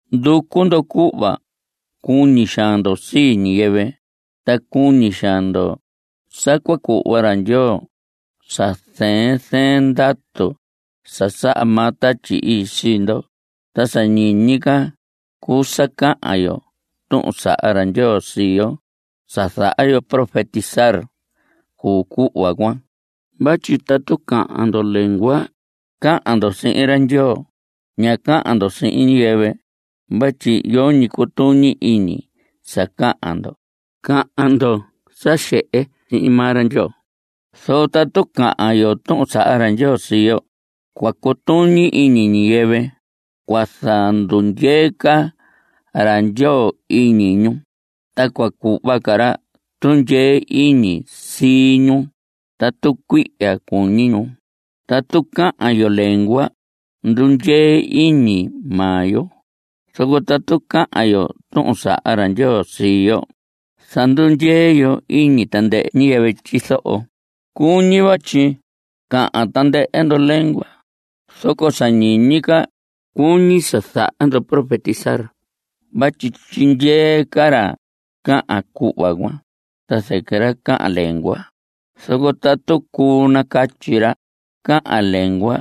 Nducu ndo cuhva cuñi xaan ndo sii ñiyɨvɨ. Ta cuñi xaan ndo sa cua cuhva ra Ndyoo sa zɨɨn zɨɨn ndatu sa saha maa Tatyi Ii sii ndo. Ta sa ñiñi ca cuu sa cahan yo tuhun saha ra Ndyoo sii yo. Sa zaha yo profetizar cuu cuhva cuan. Vatyi tatu cahan ndo lengua, cahan ndo sihin ra Ndyoo, ña cahan ndo sihin ñiyɨvɨ vatyi yoñi cutuñi iñi sa cahan ndo. Cahan ndo sa xehe sihin maa ra Ndyoo. Zoco tatu cahan yo tuhun saha ra Ndyoo sii yo, cua cutuñi iñi ñiyɨvɨ. Cua zandundyee ca ra Ndyoo iñi ñu, ta cua cuhva ca ra tundyee iñi sii ñu tatu cuihya cuñi ñu. Tatu cahan yo lengua ndundyee iñi maa yo, zoco tatu cahan yo tuhun saha ra Ndyoo sii yo zandundyee yo iñi tandɨhɨ ñiyɨvɨ tyizoho. Cuñi vatyi cahan tandɨhɨ ndo lengua, zoco sa ñiñi ca cuñi sa zaha ndo profetizar vatyi tyindyee ca ra cahan cuhva cuan ta zɨquɨ ra cahan lengua. Zoco tatu cuu nacatyi ra cahan lengua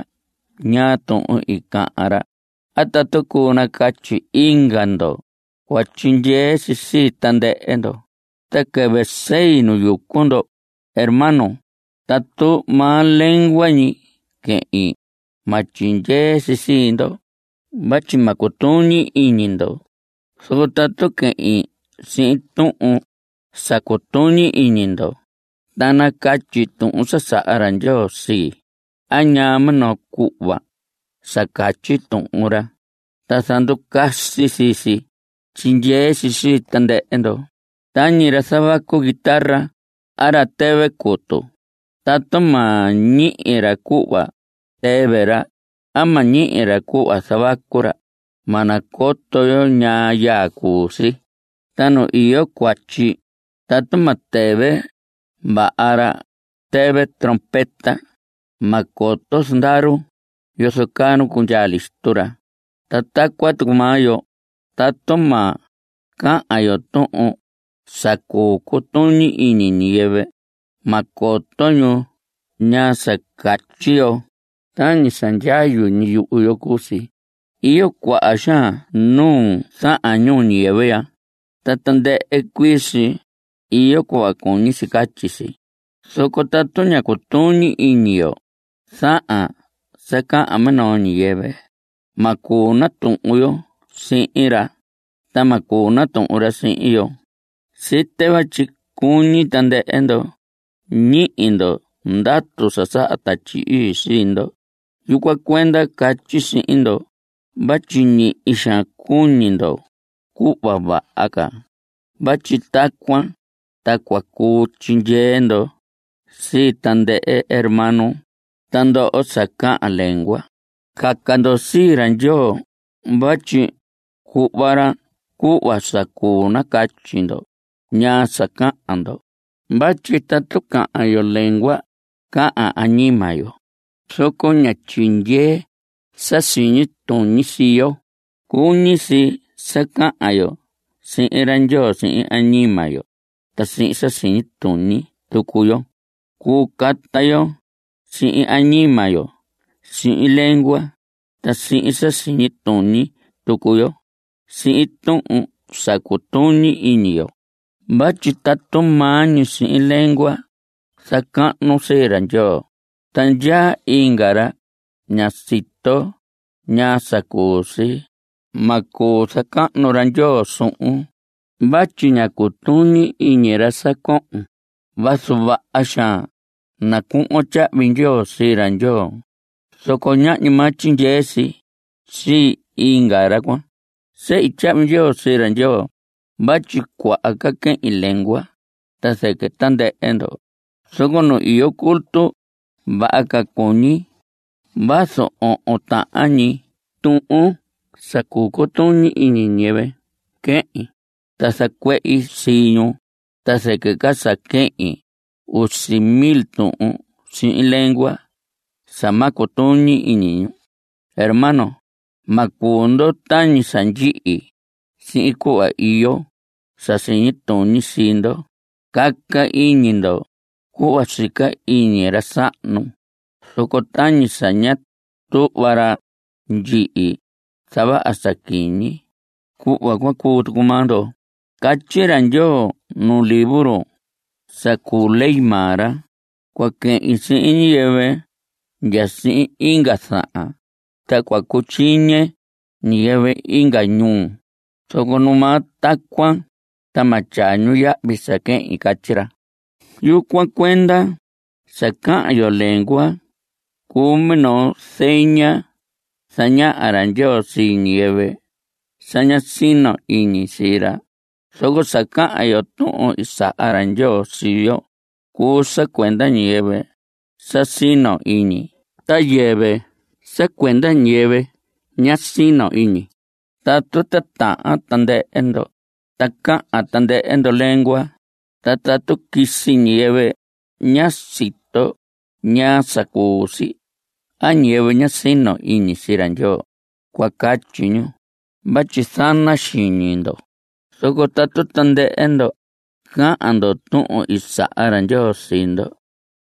ñaa tuhun i cahan ra a tatu cuu nacatyi inga ndo, cua tyindyee si sii tandɨhɨ ndo. Ta quɨvɨ sei nu yucu ndo, hermanos, tatu maa lengua ñi quehin ma tyindyee si sii ndo vatyi ma cutuñi iñi ndo. Zoco tatu quehin sihin tuhun sa cutuñi iñi ndo ta nacatyi tuhun sa saha ra Ndyoo sii a ñaa minoo cuhva sa catyi Tuhun ra ta zanducasi sii si, tyindyee si sii tandɨhɨ ndo. Tañi ra zavacu guitarra a ra tɨvɨ cutu, tatu ma ñihi ra cuhva tɨvɨ ra a ma ñihi ra cuhva zavacu ra, ma nacoto yo ñaa yaa cuu si. Ta nu iyo cuatyi tatu ma tɨvɨ vaha ra tɨvɨ trompeta, ma coto zandaru yozo caa nu cundyaa listo ra. Ta tacuan tucu maa yo, tatu ma cahan yo tuhun sa cuu cutuñi iñi ñiyɨvɨ, ma coto ñu ñaa sa catyi yo. Tañi sa ndyayu ñi yuhu yo cuu si. Iyo cuaha xaan nuu zahan ñuu ñiyɨvɨ ya, ta tandɨhɨ cuii si iyo cuhva cuñi si catyi si. Zoco tatu ña cutuñi iñi yo zahan sa cahan minoo ñiyɨvɨ, ma cuu natuhun yo sihin ra, ta ma cuu natuhun ra sihin yo. Site vatyi cuñi tandɨhɨ ndo ñihi ndo ndatu sa saha Tatyi Ii sii ndo; yucuan cuenda catyi sihin ndo vatyi ñihi xaan cuñi ndo cuhva vaha ca vatyi tacuan ta cua cuu tyindyee ndo sii tandɨhɨ hermano. Ta ndoho sa cahan lengua, caca ndo sii ra Ndyoo vatyi cuhva ra cuhva sa cuu nacatyi ndo ñaa sa cahan ndo. Vatyi tatu cahan yo lengua, cahan añima yo, zoco ña tyindyee sa siñi tuñi sii yo. Cuñi si sa cahan yo sihin ra Ndyoo sihin añima yo ta sihin sa siñi tuñi tucu yo. Cuu cata yo sihin añima yo (sihin lengua) ta sihin sa siñi tuñi tucu yo (sihin tuhun sa cutuñi iñi yo). Vatyi tatu maa ñi sihin lengua zacahnun sii ra Ndyoo ta ndyaa inga ra ña sito ñaa sa cuu si, ma cuu zacahnu ra Ndyoo suhun vatyi ña cutuñi iñi ra sa cohon. Vazu vaha xaan nacuhvon tyahvi ndyoo sii ra Ndyoo, zoco ñahñi maa tyindyee si sii inga ra cuan. Sehi tyahvi ndyoo sii ra Ndyoo vatyi cuaha ca quehin lengua ta zɨquɨ tandɨhɨ ndo. Zoco nu iyo culto vaha ca cuñi vazu ohon tahan ñi tuhun sa cuu cutuñi iñi ñiyɨvɨ quehin ta zacuehi sii ñu ta zɨquɨ ca sa quehin usi mil tuhun sihin lengua sa ma cutuñi iñi ñu. Hermanos, ma cuu ndo tañi sa ndyihi sihin cuhva iyo sa siñi tuñi sii ndo. Caca iñi ndo cuhva sica iñi ra sahnu, zoco tañi sa ña tuhva ra ndyihi zavaha sa quiñi, cuhva cuan cuu tucu maa ndo. Catyi ra Ndyoo nuu libro sa cuu ley maa ra: “Cua quehin sihin ñiyɨvɨ ya sihin inga zahan, ta cua cutyiñe ñiyɨvɨ inga ñuu, zoco numaa tacuan ta ma tyaa ñu yahvi sa quehin.” Catyi ra. Yucuan cuenda, sa cahan yo lengua cuu minoo zeña zañaha ra Ndyoo sii ñiyɨvɨ sa ña sino iñi sii ra. Zoco sa cahan yo tuhun i saha ra Ndyoo sii yo cuu sa cuenda ñiyɨvɨ sa sino iñi ta yɨvɨ sa cuenda ñiyɨvɨ ña sino iñi. Tatu titahan tandɨhɨ ndo ta cahan tandɨhɨ ndo lengua, ta tatu quisi ñiyɨvɨ ña sito ñaa sa cuu si a ñiyɨvɨ ña sino iñi sii ra Ndyoo, cua catyi ñu vatyi zana xiñi ndo. Zoco tatu tandɨhɨ ndo cahan ndo tuhun i saha ra Ndyoo sii ndo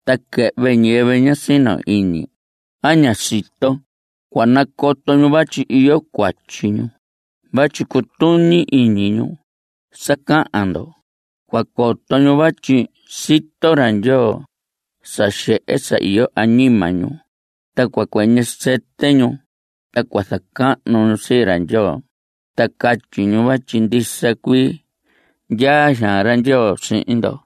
ta quɨhvɨ ñiyɨvɨ ña sino iñi a ña sito, cua nacoto ñu vatyi iyo cuatyi ñu vatyi cutuñi iñi ñu sa cahan ndo. Cua coto ñu vatyi sito ra Ndyoo sa xehe sa iyo añima ñu. Ta cua cuɨñɨ sɨtɨ ñu, ta cua zacahnu ñu sii ra Ndyoo ta catyi ñu vatyi ndisa cuii ndyaa xaan ra Ndyoo sihin ndo.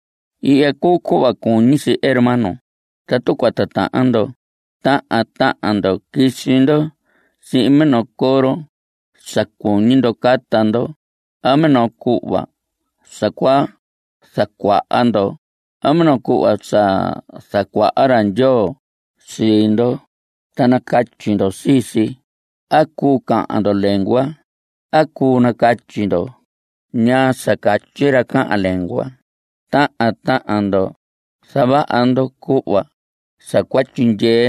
Ihya cuu cuhva cuñi si, hermanos; tatu cua titahan ndo, tahan tahan ndo quisi ndo sihin minoo coro sa cuñi ndo cata ndo a minoo cuhva sa cua zacuaha ndo a minoo cuhva sa zacuaha ra Ndyoo sii ndo, ta nacatyi ndo sii si. A cuu cahan ndo lengua a cuu nacatyi ndo ñaa sa catyi ra cahan lengua. Tahan tahan ndo zavaha ndo cuhva sa cua tyindyee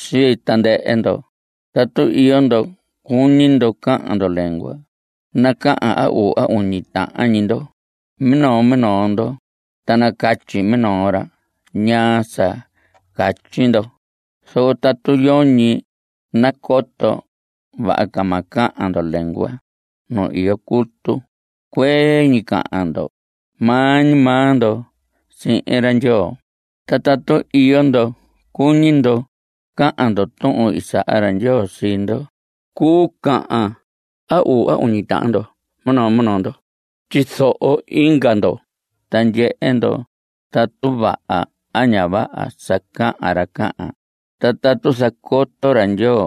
sii tandɨhɨ ndo. Tatu iyo ndo cuñi ndo cahan ndo lengua, nacahan a uu a uñi tahan ñi ndo minoo minoo ndo. Ta nacatyi minoo ra ñaa sa catyi ndo. Zoco tatu yoñi nacoto, vaha ca ma cahan ndo lengua nu iyo culto. Cuee ñi cahan ndo maa ñi maa ndo sihin ra Ndyoo. Ta tatu iyo ndo cuñi ndo cahan ndo tuhun i saha ra Ndyoo sii ndo, cuu cahan a uu a uñi tahan ndo minoo minoo ndo. Tyizoho inga ndo ta ndyehe ndo tatu vaha a ña vaha sa cahan ra cahan. Ta tatu zacoto ra Ndyoo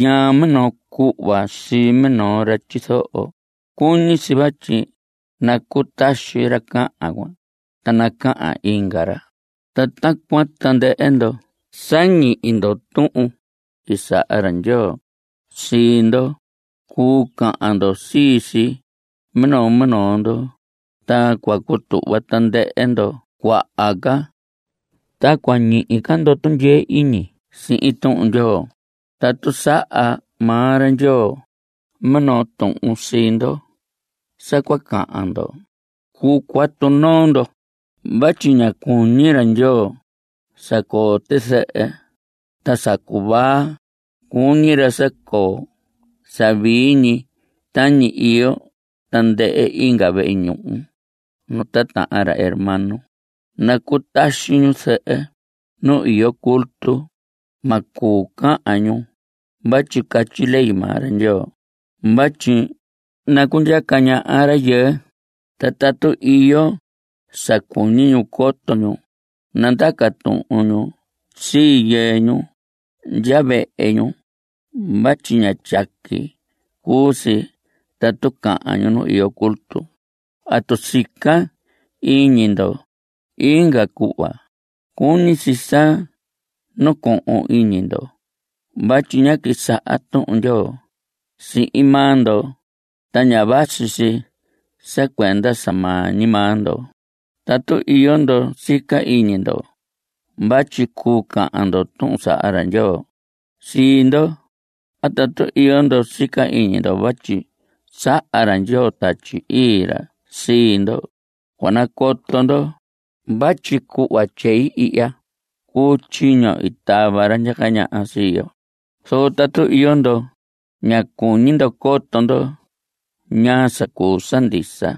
ñaa minoo cuhva sii minoo ra tyizoho, cuñi si vatyi nacutaxi ra cahan cuan ta nacahan inga ra. Ta tacuan tandɨhɨ ndo sa ñihi ndo tuhun i saha ra Ndyoo sii ndo, cuu cahan ndo sii si minoo minoo ndo, ta cua cutuhva tandɨhɨ ndo cuaha ca, ta cua ñihi ca ndo tundyee iñi sihin Tuhun Ndyoo. Tatu saha maa ra Ndyoo minoo tuhun sii ndo sa cua cahan ndo, cuu cuatu noo ndo. Vatyi ña cuñi ra Ndyoo sa coo tizɨhɨ ta sa cuvaa. Cuñi ra sa coo sa vii tañi iyo tandɨhɨ inga vehe ñuhu nu titahan ra hermano. Nacutaxi ñu zɨhɨ nu iyo culto. Ma cuu cahan ñu vatyi catyi ley maa ra Ndyoo vatyi nacundyaca ñaha rayɨɨ. Ta tatu iyo sa cuñi ñu coto ñu, nandaca tuhun ñu sii yɨɨ ñu ndya vehe ñu vatyi ña tyaqui cuu si tatu cahan ñu nu iyo culto. Tatu sica iñi ndo inga cuhva, cuñi si sa nacohon iñi ndo vatyi ñá quisaha Tuhun Ndyoo sihin maa ndo. Ta ña vasi si sa cuenda sa maa ñi maa ndo. Tatu iyo ndo sica iñi ndo vatyi cuu cahan ndo tuhun saha ra Ndyoo sii ndo a tatu iyo ndo sica iñi ndo vatyi saha ra Ndyoo Tatyi Ii ra sii ndo, cua nacoto ndo vatyi cuhva tyei ihya cuu tyiño i tava ra ndyaca ñaha sii yo. Zoco tatu iyo ndo ña cuñi ndo coto ndo ñaa sa cuu sa ndisa,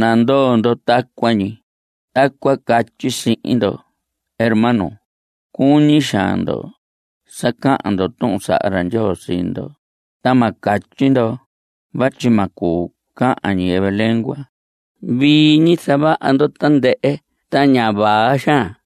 nandoo ndo tacuan ñi. Tacuan catyi sihin ndo hermanos, cuñi xaan ndo sa cahan ndo tuhun saha ra Ndyoo sii ndo, ta ma catyi ndo vatyi ma cuu cahan ñiyɨvɨ lengua. Vii ñi zavaha ndo tandɨhɨ ta ña vaa xaan.